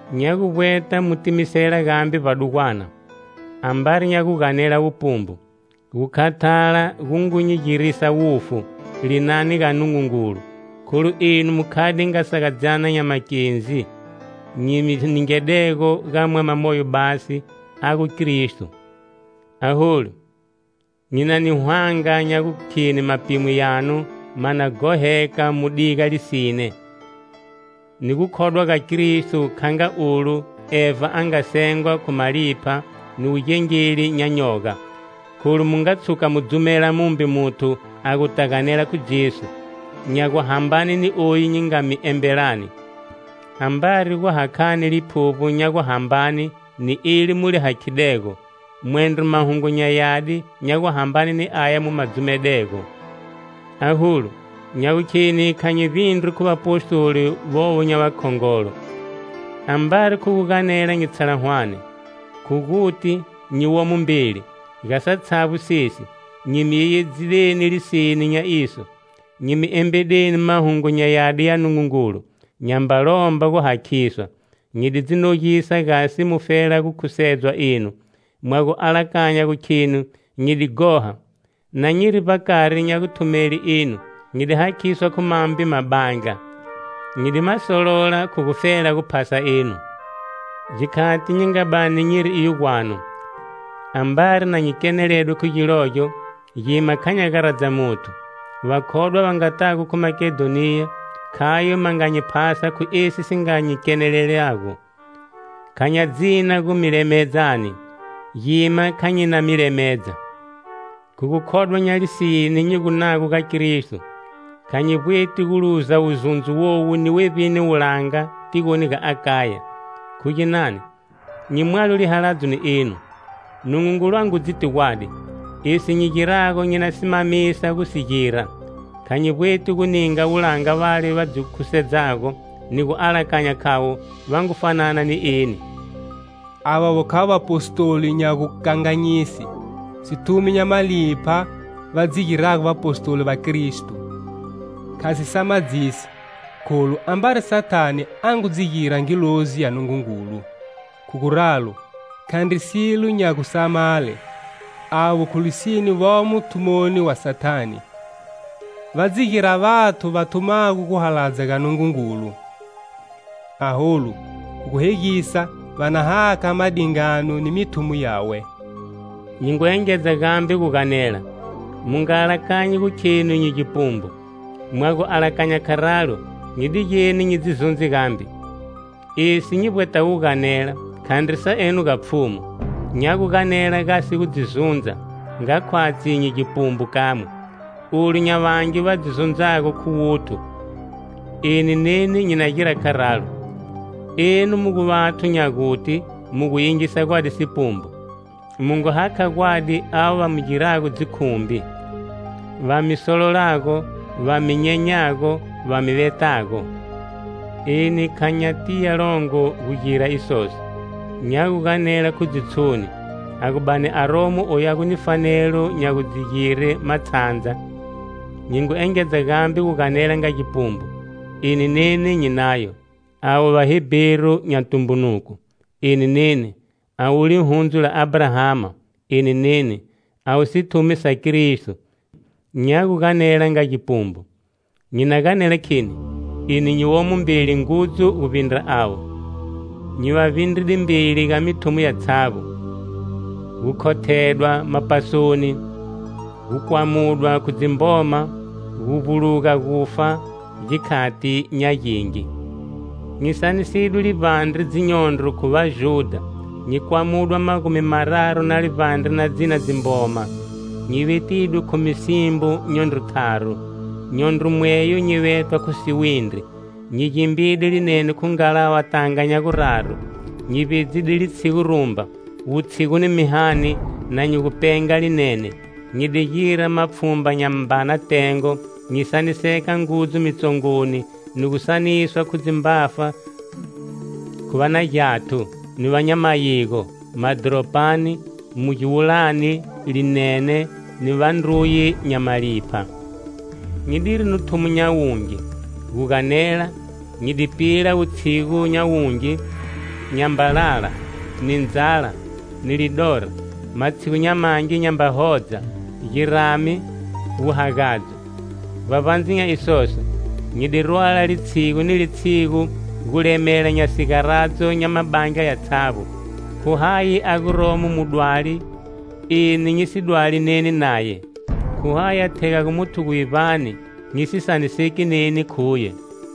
Nya gu vbweta mu timisela gambe vbadugwana, ambari nya gu ganela wupumbu! Gu khathala gu ngu nyi girisa wufu, linani ga Nungungulu. Kholu enu mu khade nga sagadzyana nya makendzi, nyi mi ningedego ga mwama moyo basi, a gu Kristo. Aholu, nyi na ni hwanga nya gukheni mapimo yanu ma na ghoheka mu diga lisine, ni gukhodwa ga Kristo, kha nga olu Eva a nga sengwa khu malipha ni wugengeli nya nyoga. Kholu mu nga tshuka mu dzumela mumbe muthu a guta ganela khu Jesu, nya guhambane ni oyu nyi nga mi embelani, ambari gu hakhani Liphuvbo nya guhambane ni eli mu li hakhidego, mwendro Mahungu nya Yadi nya guhambane ni aya mu ma dzumedego. Aholu, nya gukheni kha nyi vbindrwi khu vapostoli vovo nya vakhongolo. Ambari khu gu ganela nyi tshala hwane, khu guti, nyi womo mbeli. Ga satshavbo sesi, nyi mi yeyedzideni lisine nya iso. Nyi mi embedeni Mahungu nya Yadi ya Nungungulu, nyamba lomba gu hakhiswa. Nyi di dzi nogisa gasi mufela gu khusedzwa enu. Mwa gu alakanya gu khenu nyi di ghoha? Na nyiri vbakari nya guthumele enu, nyi di hakhiswa khu mambe mabandla. Nyi di ma solola khu gufela gu phasa enu. Gikhati nyi nga bani nyiri iyo gwanu, ambari na nyi keneledwe khu gilogyo gima kha nya garadza muthu. Vakhodwa va nga tago khu Makedhoniya, khayo va nga nyi phasa khu esi si nga nyi kenelelago. Kha nya dzina gu mi lemedzani, gima kha nyi na mi lemedza. Khu gukhodwa nya lisine nyi gunago ga Kristo, kha nyi vbweti gu luza wuzundzo wowu ni wevbini wulanga tigoni ga Akaya. Khu ginani? Nyi mwalo lihaladzo ni enu? Nungungulu a ngu dziti gwadi! Esi nyi girago, nyi na simamisa gu si gira. Kha nyi vbweti gu ninga wulanga vale va dzi khusedzago ni gu alakanya khavo va ngu fanana ni eni. Avovo khavo vapostoli nya gukanganyise, sithumi nya malipha va dzi girago vapostoli va Kristo. Kha si samadzisi, kholu ambari Sathane a ngu dzi gira ngilozi ya Nungungulu. Khu guralo, khandri silo nya gusamale, avo khu lisine vomo thumoni wa Sathane, va dzi gira vathu va thumago gu haladza ga Nungungulu. Aholu khu gu hegisa va na hakha ma dingano ni mithumo yawe. Nyi ngu engedza gambe gu ganela: mu nga alakanyi gu khenu nyi gipumbu. Mwa gu alakanya kharalo, nyi digeni nyi dzi zundze gambe. Esi nyi vbwetago guganela khandri sa eno ga Pfhumu, nya gu ganela gasi gu dzi zundza, nga khwatshi nyi gipumbu kamwe. Olu nya vangi va dzi zundzago khu wuthu, eni neni nyi na gira kharalo. Enu mu gu vathu nya guti mu gu yingisa gwadi sipumbu. Mu ngu haka gwadi ava va mi girago dzikhumbi, va mi sololago, va mi nyenyago, va mi vetago. Eni kha nya tiya longo gugire isoso. Nya gu ganela khu dzitshoni! A gu bani aromo oyu a gu ni fanelo nya gudzigire matshandza, nyi ngu engedza gambe guganela nga gipumbu, eni neni nyi nayo. Avo Vaheberu nya tumbunuko? Eni neni! Avo Lihundzu la Abrahama? Eni neni! Avo sithumi sa Kristo? Nya guganela nga gipumbu, nyi na ganela kheni, eni nyi womo mbeli ngudzu guvbindra avo. Nyi va vbindride mbeli ga mithumo yatshavbo; gu khothedwa mapasoni, gu kwamudwa khu dzimboma, gu vbuluga gufa gikhati nya gingi. Nyi sanisidwe livbandre dzinyondro khu Vajudha, nyi kwamudwa magumi-mararu na livbandre na dzina dzimboma. Nyi vetidwe khu misimbo nyondro tharu, nyondro mweyo nyi vetwa khu siwindri. Nyi gimbide linene khu ngalava tanga nya guraru, nyi vbedzide litshigu rumba, wutshigu ni mihani, na nyi gu penga linene. Nyi di gira mapfhumba nya mbana tengo, nyi saniseka ngudzu mitsongoni, ni gu saniswa khu dzimbafa, khu va na gyathu, ni va nya mayigo, madhoropani, mu giwulani, linene, ni vandruye nya malipha. Nyi diri ni thumo nya wungi, gu ganela, nyi di pila wutshigu nya wungi, nyamba lala, ni ndzala, ni lidora, matshigu nya mangi nyamba hodza, girame, wuhagadzo. Vbavbandze nya isoso, nyi di rwala, litshigu ni litshigu, gulemela nya sigaradzo nya Mabandla yatshavbo. Khu hayi a guromo mudwali, eni nyi si dwali neni naye? Khu hayi a thegago muthu guvivbani, nyi si saniseki neni khuye?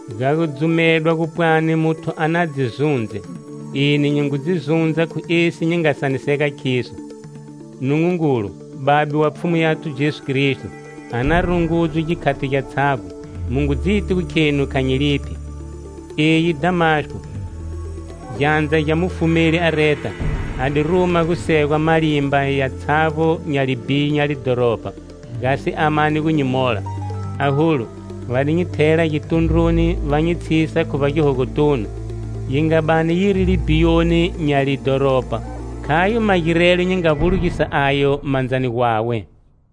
Ga gudzumedwa gu pwani muthu a na dzi zundze, eni nyi ngu dzi zundza khu esi nyi nga saniseka khiso. Nungungulu, Babe wa Pfhumu yathu Jesu Kristo a na rungudzwe gikhati gyatshavbo mu ngu dziti khenu kha nyi liphi. Eyi Dhamasko, gyandza gya mufumeli Areta, a di ruma gu segwa malimba yatshavbo nya libhiyo nya lidhoropa, gasi a mane gu nyi mola. Aholu, va di nyi thela gitundruni va nyi tshisa khu vbagihogotunu, yi nga bani yiri libhiyoni nya lidhoropa, khayo magirelo nyi nga vbulugisa ayo mandzani gwawe.